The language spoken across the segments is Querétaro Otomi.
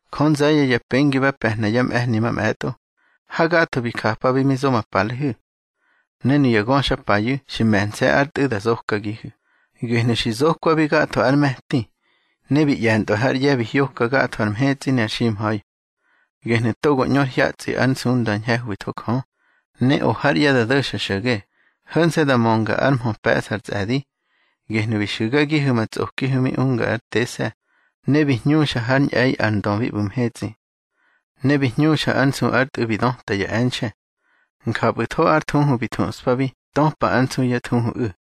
Jö nze̱ye̱ ya pengi ba pe̱hna yá mꞌe̱hni mamꞌe̱tꞌo, hagatho bi japabi mi zo ma palehu̱. Ne nuya ngöxapayu̱ xi me̱nse̱ ár Tꞌu̱ da zokagihu̱. Gehnu̱ xi zokwabi gatho ár me̱ti, ne bi ꞌye̱ntꞌwa hár ꞌye̱ bi hyoka gatho ar mhetsꞌi ne ar ximha̱i. Gehnu̱ togo ñꞌu ár hyatsꞌi ár nsunda ñhe̱hwitho Jö, ne o hár ꞌye̱ da do̱xa xo̱ge, ho̱nse̱ da mönga ár mhö pe̱ꞌsa ar tsꞌe̱di. Gehnu̱ bi xu̱gagihu̱ ma tsꞌokihu̱ mi unga ár tese̱, ne bi hñuxa hár ñꞌe̱i ar Ndö bi ꞌbu̱ mhetsꞌi. Ne bi hñuxa ár nsu ár Tꞌu̱ bi döta ya e̱nxe̱. Njapꞌu̱tho ár thuhu bi thuꞌspabi töpa ár nsu yá thuhuꞌu̱.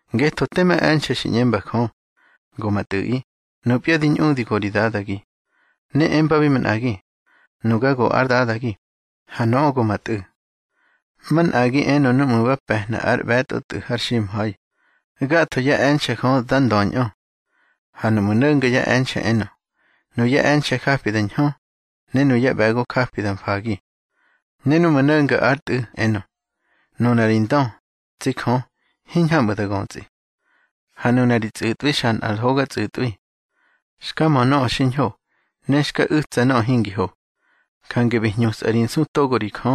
Ngetho tema e̱nxe̱ xi ꞌñemba Jö: Go ma Tꞌu̱ꞌi, nupya di ñꞌudi go ri Dadagi. Ne embabi manꞌagi: Nuga go ár Dadagi, ha nöꞌö go ma Tꞌu̱. Manꞌagi enö núꞌmu̱ ba pe̱hna ár ꞌbe̱tꞌo Tꞌu̱ har ximha̱i: Gatho yá e̱nxe̱ Jö dá ndöñꞌö. Ha núꞌmu̱ no̱nga ya e̱nxe̱ enö: Nuyá e̱nxe̱ japi da ñhö, ne nuyá ꞌbe̱go japi da mfagi. Ne núꞌmu̱ no̱nga ár Tꞌu̱ enö: Nuna ri ndö, tsi Jö, hiñhamꞌu̱ da götsꞌi, ha nuna ri tsꞌu̱tꞌwi xa nꞌar hoga tsꞌu̱tꞌwi. Xka mö nöꞌö xiñho, ne xka u̱tsa nöꞌö hingi ho. Jange bi hñusꞌa ri nsu togo ri Jö.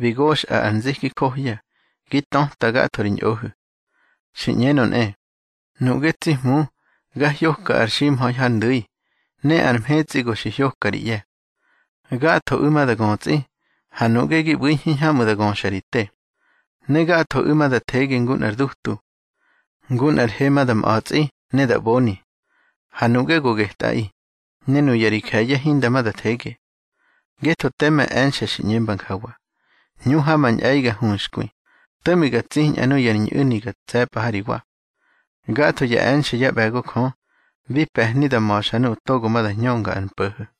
Bi goxꞌa ar nziki johya, gi töta gatho ri ñꞌohu̱. Xi ꞌñenö nꞌe: Nuꞌge, tsi Hmu, ga hyoka ar ximha̱i hár ndu̱i, ne ar mhetsꞌi go xi hyoka ri ꞌye̱. Gathoꞌu̱ ma da götsꞌi, ha nuꞌge gi ꞌbu̱i hiñhamꞌu̱ da göxa ri te. Ne gathoꞌu̱ ma da thege ngu nꞌar dutu. Ngu nꞌar he ma da mꞌa̱tsꞌi ne da ꞌboni. Ha nuꞌge go getꞌaꞌi, ne nuya ri je̱ye̱ hinda ma da thege. Ngetho tema e̱nxe̱ xi ꞌñemba njawa: Hñu ha ma ñꞌe̱i ga huxkwi, to̱ꞌmi ga tsiñꞌa nuya ri ñꞌu̱ni ga tse̱pꞌa ha ri wa. Gatho ya e̱nxe̱ yá ꞌbe̱go Jö, bi pe̱hni da ma̱xa nuꞌu̱ togo ma da hñönga ar mpo̱ho̱.